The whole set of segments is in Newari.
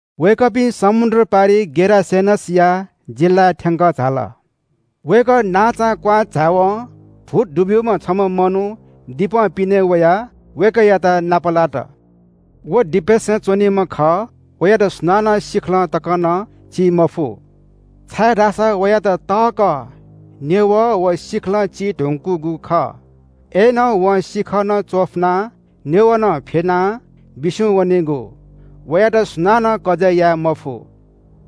वय्‌कःपिं समुद्र पारिइ गेरासेनसया जिल्‍लाय् थ्‍यंकः झाल। वय्‌कः नांचां क्‍वहां झाय्‌वं भूत दुब्‍यूम्‍ह छम्‍ह मनू दिपं पिने वयाः वय्‌कःयात नापलात। व दिपय्‌सं च्‍वनीम्‍ह खः। वयात सुनानं सिखलं तक नं ची मफु, छाय्‌धाःसा वयात तःकः न्‍यवः व सिखलं ची धुंकूगु खः। अय्‌नं वं सिखः नं चफुनाः न्‍यवः नं फ्‍यनाः बिस्‍युं वनीगु। वयात सुनानं कजय् याये मफु।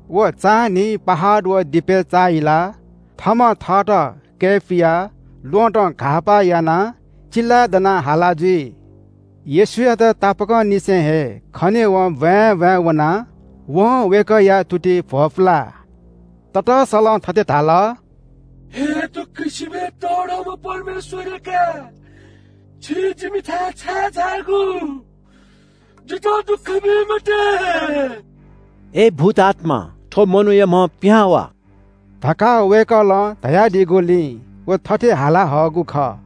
व चान्‍हिं पहाड व दिपय् चाःहिलाः थःम्‍हं थःत कय्‌पुयाः ल्‍वहँतं घाःपा यानाः चिल्‍लाय् दनाः हाला जुइ। येशूयात तापाकंनिसें हे खनेवं ब्‍वाँय् ब्‍वाँय् वनाः वं वय्‌कःया तुतिइ भ्‍वपुलाः ततःसलं थथे धाल – “हे दक्‍वसिबय् तःधंम्‍ह परमेश्‍वरया काय्, छि जिमिथाय् छाय् झायागु? जितः दुःख बी मते।” “अय् भूतआत्‍मा, थ्‍व मनूया म्‍हं पिहां वाः” धकाः वय्‌कलं धयादीगुलिं व थथे हाला हःगु खः।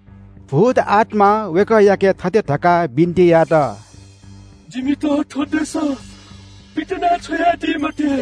भूतआत्‍मां वय्‌कःयाके थथे धकाः बिन्‍ति यात – “जिमित थ्‍व देशं पितिना छ्वयादी मते।”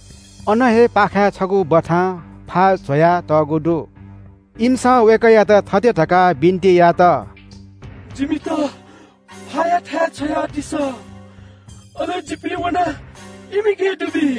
अन हे पाखाय् छगू बथां फा ज्‍वया तःगु दु। इमिसं वय्‌कःयात थथे धकाः बिन्‍ति यात – “जिमित फाया थाय् छ्वयादिसँ, अले जिपिं वनाः इमिके दुबी।”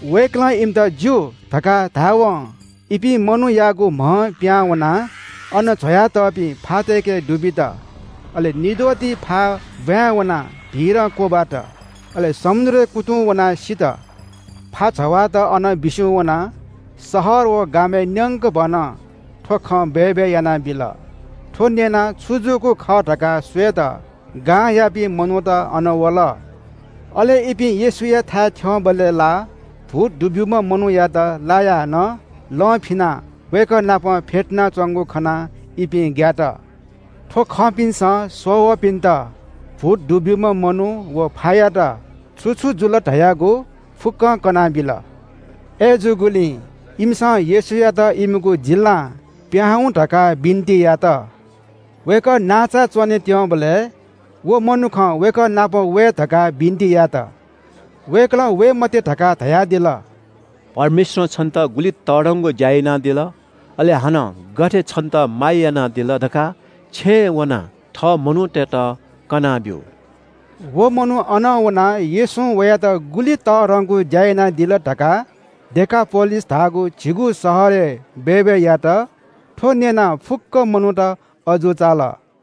वय्‌कलं इमित ज्‍यू धकाः धाय्‌वं इपिं मनूयागु म्‍हं पिहां वनाः अन ज्‍वयातःपिं फातय्‌के दुबित। अले निद्वःति फा ब्‍वाँय् वनाः भीरं क्‍वब्‍वात। अले समुद्रय् कुतुं वनाः सित। फा जवाःत अनं बिस्‍युं वनाः शहर व गामय् न्‍यंकभनं थ्‍व खँ बय्‌बय् यानाबिल। थ्‍व न्‍यनाः छु जूगु खः धकाः स्‍वयेत गांयापिं मनूत अन वल। अले इपिं येशूयाथाय् थ्‍यंबलय् ला भूत दुब्‍यूम्‍ह मनूयात लायाः नं लं फिनाः वय्‌कः नाप फ्‍यतुनाच्‍वंगु खनाः इपिं ग्‍यात। थ्‍व खंपिन्‍सं स्‍ववःपिन्‍त भूत दुब्‍यूम्‍ह मनू व फायात छु छु जुल धयागु फुक्‍कं कनाबिल। अय्‌जूगुलिं इमिसं येशूयात इमिगु जिल्‍लां पिहां हुँ धकाः बिन्‍ति यात। वय्‌कः नांचाय् च्‍वने त्‍यंबलय् भुत दुब्‍यूम्‍ह मनुखं वय्‌कः नाप वये धकाः बिन्‍ति यात। वय्‌कलं वये मते धकाः धयादिल। “परमेश्‍वरं छन्‍त गुलि तःधंगु ज्‍या यानादिल, अले हानं गथे छन्‍त माया क्‍यनादिल धकाः छेँय् वनाः थः मनूतय्‌त कनाब्‍यु।” व मनू अनं वनाः येशूं वयात गुलि तःधंगु ज्‍या यानादिल धकाः डेकापोलिस धाःगु झिगू शहरय् बय्‌बय् यात। थ्‍व न्‍यनाः फुक्‍क मनूत अजू चाल।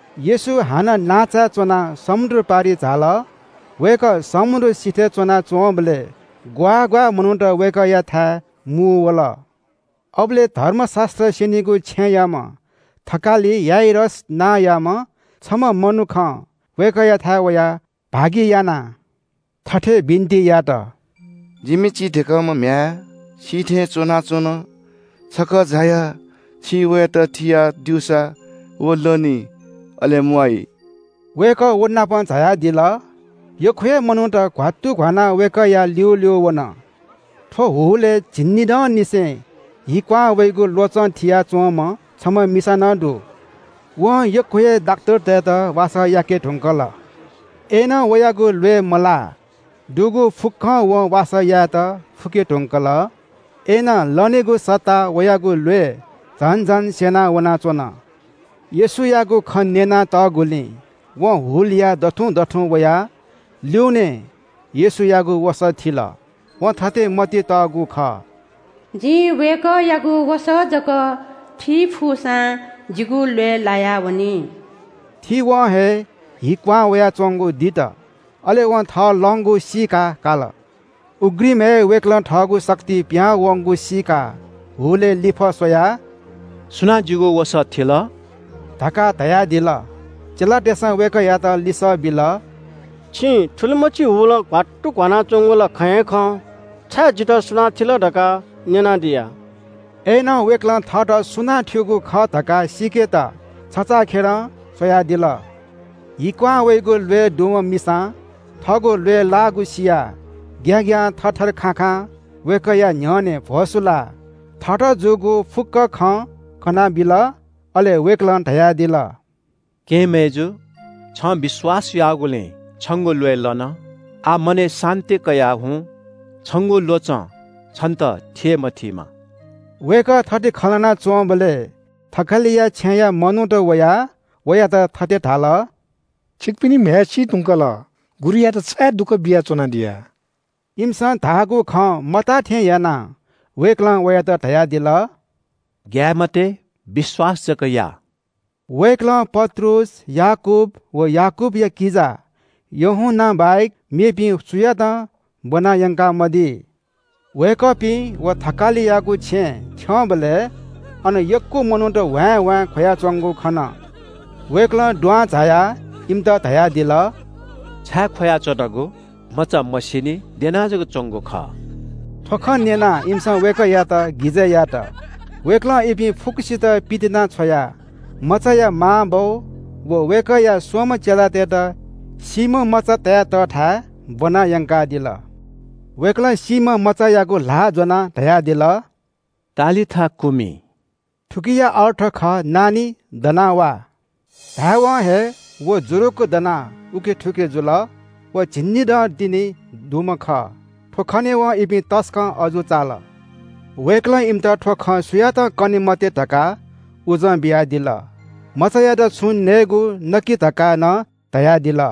येशू हानं नांचाय् च्‍वनाः समुद्र पारिइ झाल। वय्‌कः समुद्र सिथय् च्‍वनाच्‍वंबलय् ग्‍वाः ग्‍वाः मनूत वय्‌कःयाथाय् मुंवल। अबलय् धर्मशास्‍त्र स्‍यनीगु छेँयाम्‍ह थकालि याइरस नांयाम्‍ह छम्‍ह मनुखं वय्‌कःयाथाय् वयाः भागियानाः थथे बिन्‍ति यात – “जिमि चीधिकःम्‍ह म्‍ह्याय् सी थें च्‍वनाच्‍वन। छकः झायाः छिं वयात थिया द्यूसा व लनी, अले म्‍वाइ।” वय्‌कः व नाप झायादिल। यक्‍व हे मनूत घ्‍वात्तुघ्‍वानाः वय्‌कःया ल्‍यूल्‍यू वन। थ्‍व हुलय् झिंनिदंनिसें हि क्‍वहां वइगु ल्‍वचं थिया च्‍वंम्‍ह छम्‍ह मिसा नं दु। वं यक्‍व हे डाक्‍टरतय्‌त वासः याके धुंकल। अय्‌नं वयागु ल्‍वय् मलाः। दुगु फुक्‍कं वं वासः यायेत फुके धुंकल, अय्‌नं लनेगु सट्टा वयागु ल्‍वय् झन झन स्‍यना वनाच्‍वन। येशूयागु खँ न्‍यनातःगुलिं वं हुलया दथुं दथुं वयाः ल्‍यूनें येशूयागु वसः थिल। वं थथे मतिइ तःगु खः – “जिं वय्‌कःयागु वसः जक थी फुसां जिगु ल्‍वय् लायावनी।” थीवं हे हि क्‍वहां वयाच्‍वंगु दित, अले वं थः लंगु सीकाकाल। उघ्रिमय् वय्‌कलं थःगु शक्ति पिहां वंगु सीकाः हुलय् लिफः स्‍वयाः – “सुनां जिगु वसः थिल?” धकाः धयादिल। चेलातय्‌सं वय्‌कःयात लिसः बिल – “छिं थुलिमछि हुलं घ्‍वात्तु घ्‍वानाच्‍वंगु ला खँ हे खं। छाय् ‘जितः सुनां थिल’ धकाः न्‍यनादिया?” अय्‌नं वय्‌कलं थःत सुनां थ्‍यूगु खः धकाः सीकेत छचाःखेलं स्‍वयादिल। हि क्‍वहां वइगु ल्‍वय् दुम्‍ह मिसां थःगु ल्‍वय् लाःगु सियाः ग्‍याग्‍यां, थरथर खाखां वय्‌कःया न्‍ह्यःने भ्‍वसुलाः थःत जूगु फुक्‍क खँ कनाबिल। अले वय्‌कलं धयादिल – “केहेँ मय्‌जु, छं विश्‍वास याःगुलिं छंगु ल्‍वय् लन। आः मनय् शान्‍ति कयाः हुँ, छंगु ल्‍वचं छन्‍त थी हे मथीमा।” वय्‌कः थथे खँ ल्‍हाना च्‍वंबलय् थकालिया छेँया मनूत वयाः वयात थथे धाल – “छिकपिनि म्‍ह्याय् सी धुंकल। गुरुयात छाय् दुःख बिया च्‍वनादिया?” इमिसं धाःगु खँ मताः थें यानाः वय्‌कलं वयात धयादिल – “ग्‍याये मते, विश्‍वास जक या।” वय्‌कलं पत्रुस, याकूब व याकूबया किजा यूहन्‍ना बाहेक मेपिं सुयातं ब्‍वनायंकामदी। वय्‌कःपिं व थकालियागु छेँय् थ्‍यंबलय् अन यक्‍व मनूत ह्वाँय्‌ह्वाँय् ख्‍वयाच्‍वंगु खन। वय्‌कलं दुहां झायाः इमित धयादिल – “छाय् ख्‍वयाच्‍वनागु? मचा मसीनि, द्यना जक च्‍वंगु खः।” थ्‍व खँ न्‍यनाः इमिसं वय्‌कःयात गिजय् यात। वय्‌कलं इपिं फुक्‍कसित पितिनाछ्वयाः मचाया मांबौ व वय्‌कःया स्‍वम्‍ह चेलातय्‌त सीम्‍ह मचा तया तःथाय् ब्‍वना यंकादिल। वय्‌कलं सीम्‍ह मचायागु ल्‍हाः ज्‍वनाः धयादिल – “तालिथा कूमि!” थुकिया अर्थ खः – “नानी, दना वा!” धाय्‌वं हे व जुरुक्‍क दनाः थुखे उखे जुल। व झिंनिदँ तिनि दुम्‍ह खः। थ्‍व खनेवं इपिं तसकं अजू चाल। वय्‌कलं इमित थ्‍व खँ सुयातं कने मते धकाः उजं बियादिल। मचायात छुं नयेगु नकि धकाः नं धयादिल।